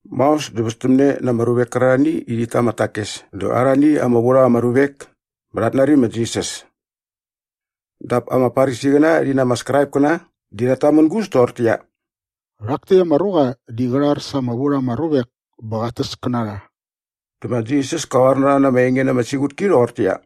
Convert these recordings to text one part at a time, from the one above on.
Maos dä väspästämne na ama ruvek kärarhani i rhit ta ama takes dä arhani ama vu rha ama ruvek bä rhat nari ma Jisas. Dap ama Farisiqäna rhi na ama Skraipkäna di rhat tamängus toqortäqyia, “Rhak täkt ama ruqa di qä rhar sa ama vu rha ama ruvek bä qat täs kä na rha.” Dä ma Jisas kä qoar na rha na ama enge na ama siqutki rhoqortäqyia,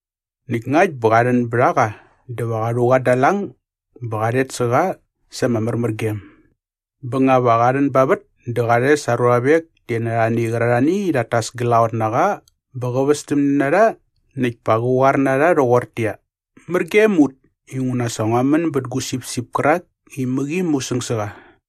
Näkt ngakt bä qa rhän bät a qa dä va qa rhu qa da aa lang bä qa rhet sä qa sa ama märmärgem. Bä nga va qa rhän ba vät dä qa rhes aa ruavek ti na arhani qärarhani i rhat tas glaqot na qa bä va västämne na rha näkt pa qä qoar na rha rhoqortäqyia, ‘Mär gem ut inguna sa ngua män bät gu sipsip kärak i mäqi musäng sä qa!’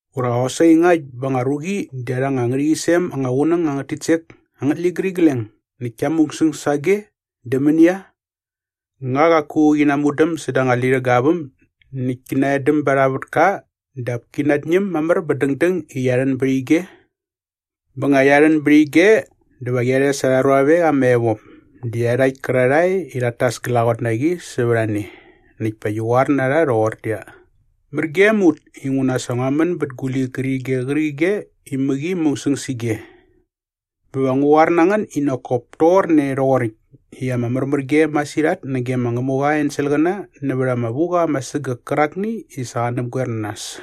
“Ura qosaqi ngakt bä nga anga ruqi di arha anga ngärhäqyisem ama qunäng angät titsek angät ligärigleng näkt kia musäng sa age, dä mänia? Nga qaku qi namudäm säda anga lirhäga aa väm näkt ki naedäm ba arha vätka dap ki natñäm mamär bä dängdäng i qia rhän bät ige? Bä nga qia rhän bät ige dä va qia rhes arha ruavek ama evop dä iarhakt kärarhae i rhat tas glaqot na qi sävät a ne näkt pa qi qoar na rha toqortäqyia, ‘Mär gem ut inguna sa ngua män bät gu ligärige qärqige i mäqi musäng sä ige.’ “Bä va ngu qoar na ngän i nak kop toqorne rhoqoräkt i ama märmärgem masirhat nage ma Ngämuqa aa enselqäna nävät ama vuqa ama sägäk kärakni i sa qa näpgoer na nas.”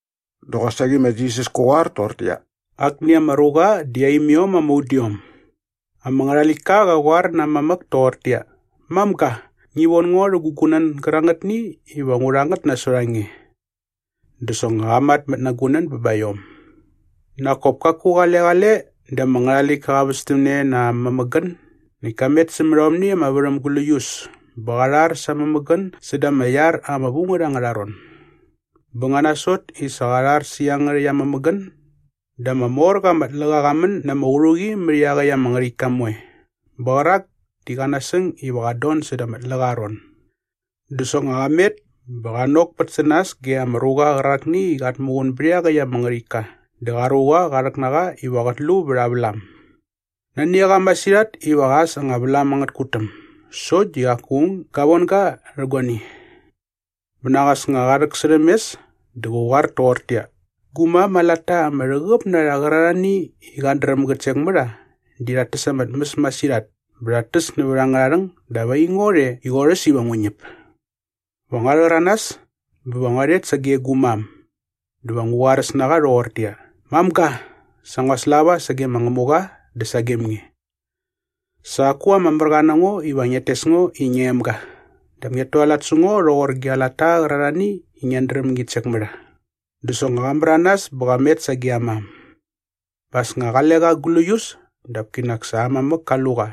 Dä qosaqi ma Jisas kä qoar toqortäqyia, “Akni ama ruqa di aa imiom ama udiom. Ama ngärhaläktka qä qoar na aa mamäk toqortäqyia, ‘Mamga, ngi von ngo rhä gu gunän gärangätni iva ngu rha ngät nasot a nge.’ Dä soknga qa matmät aa gunän bä ba iom.” “Nak kop kaku qale qale dä ama ngärhaläktka qa västämne na aa mämägän näkt ka met sämät aomni ama värhäm gläius bä qa rhar sa aa mämägän säda ama iar ama vu ngät angärha ron. Bä nga nasot i sa qa rhar sä iangärhäkt aa mämägän dä ama mor qa ama tläqa qa män na ama qärhuqi mät iaqäkt ama ngärhäktka moe bä qärak di qä nasäng iva qat don säda ama tläqa aa ron. “Dä soknga qa met bä qa nokpät sä nas ge ama ruqa qärakni i qat muqun bät iaqäkt ama ngärhäktka dä qa ruqa qa rhäk na qa iva qät lu vät aa vlam. Nani a qa masirhat iva qä äs anga vlam angät tkutäm sokt di qaku aung ga von ga rhä guani.” “Bä nak as nga qa rhäksärhäm mes dä qä qoar toqortäqyia, ‘Gu mam aa latta ama rhäqäp na rha qärarhani i qat dräm gät sek mä rha di rhat täs ama tmäs masirhat bä rhat täs nävät angärha rhäng dap aingo rhe i qorhäs iva ngu ñäp! Va ngua rhäranas bä va ngua rhet sage gu mam dä va ngu qoaräs na qa rhoqortäqyia, “Mamga, sa ngua slava sage ma Ngämuqa dä sagem nge. Sa qaku ama märqa na ngo iva ngiat tes ngo i ngia emga dap ngiat tualat sä ngo rhoqor gia latta qärarhani i ngiat dräm ngit sek mä rha.” ’ “Dä soknga qa märanas bä qa met sage aa mam. Bä as nga qale qa gläius dap kinak sa aa mamäk ka lu qa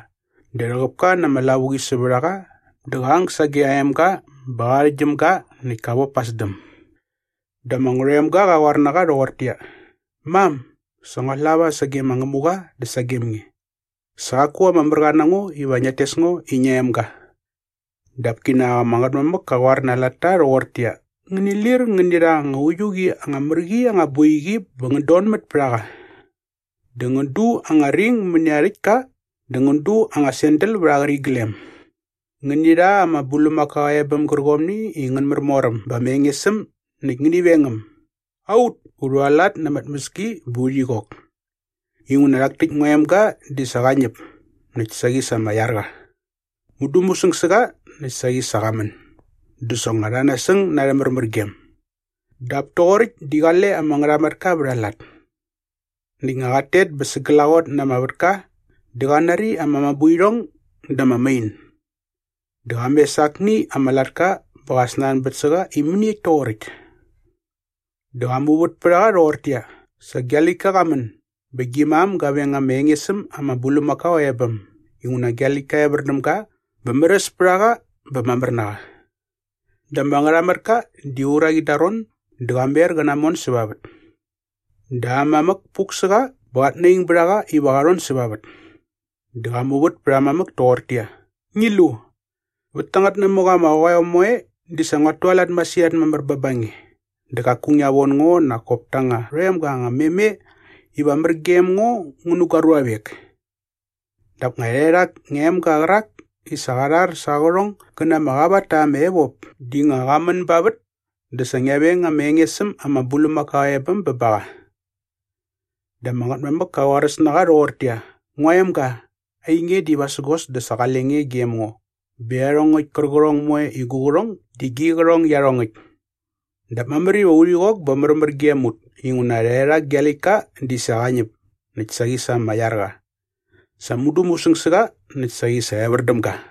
dä rhäqäp ka na ama lavuqi sävät a qa dä qa ang sage aa emga bä qa qärhäktgyäm ga näkt ka vop pa aa sdäm.” “Dä ama ngärhoemga qa qoar na qa rhoqortäqyia, ‘Mam, sa ngua slava sage ma Ngämuqa dä sagem nge. Sa qaku ama märqa na ngo iva ngiat tes ngo i ngia emga.’” “Dap kinak ama ngätmamäk kä qoar na aa latta rhoqortäqyia, ‘Ngäni lir ngäni rha anga uiu qi anga mär qi anga boiqi bä ngän donmät pät a qa. Dä ngän du anga ring mäni aa rhäktka dä ngän du anga sandal vät aa qäriglem. Ngäni rha ama bulmakao aa ebäm gärqomni i ngän märmor äm bä ama enges äm näkt ngäni veng äm. Aut, u rhualat na ama tmäski bä urhi qok. Inguna rhak täkt ngua emga di sa qa ñäp näkt saqi sa ama iar qa. Mudu musäng sä qa näkt saqi sa qa män.’ Dä soknga rha nasäng na arhä märmärgem.” “Dap toqoräkt di qale ama ngärhamatka vät a lat. Näkt nga qat tet bä sa glaqot na ama vätka dä qa nari ama mabuirhong dä ama main. Dä qa mes akni ama latka bä qa snanbät sä qa i mäniekt toqoräkt. “Dä qa muvät pät a qa rhoqortäqyia, ‘Sa gia läktka qa män bä gi mam ga veng ama enges äm ama bulmakao aa ebäm inguna gia läktka evär däm ga bä märäs pät a qa bä mamär na qa.’” “Dä ama ngärhamatka di uraqi da aa ron dä qa mer qä namon säva vät. “Dä aa mamäk puk sä qa bä qat naing bät a qa iva qa rhon säva vät. Dä qa muvät pät aa mamäk toqortäqyia, ‘Ngi lu! Vät tangät namäk ama qoeo moe di sa nguat tualat masirhat mamär bä ba nge dä qaku ngia von ngo nak kop ta anga rhoemga anga meme iva mär gem ngo ngu nä gua ruavek. Dap nga rhaerhak ngia emga qärak i sa qa rhar sa aa qärhong gä na ama qavat ta ama evop di nga qa män ba vät dä sa ngia veng ama enges äm ama bulmakao aa ebäm bä ba qa!’” “Dä ama ngätmamäk kä qoaräs na qa rhoqortäqyia, ‘Ngua emga, ainge di vasägos dä sa qale nge gem ngo bä iarhongäkt kärqärhong moe i gu qärhong di gi qärhong iarhongäkt. Dap mamär iva urhi qok bä märmär gem ut inguna rhaerhak gia läktka di sa qa ñäp näkt saqi sa ama iar qa. Sa mudu musäng sä qa näkt saqi sa evär däm ga.’”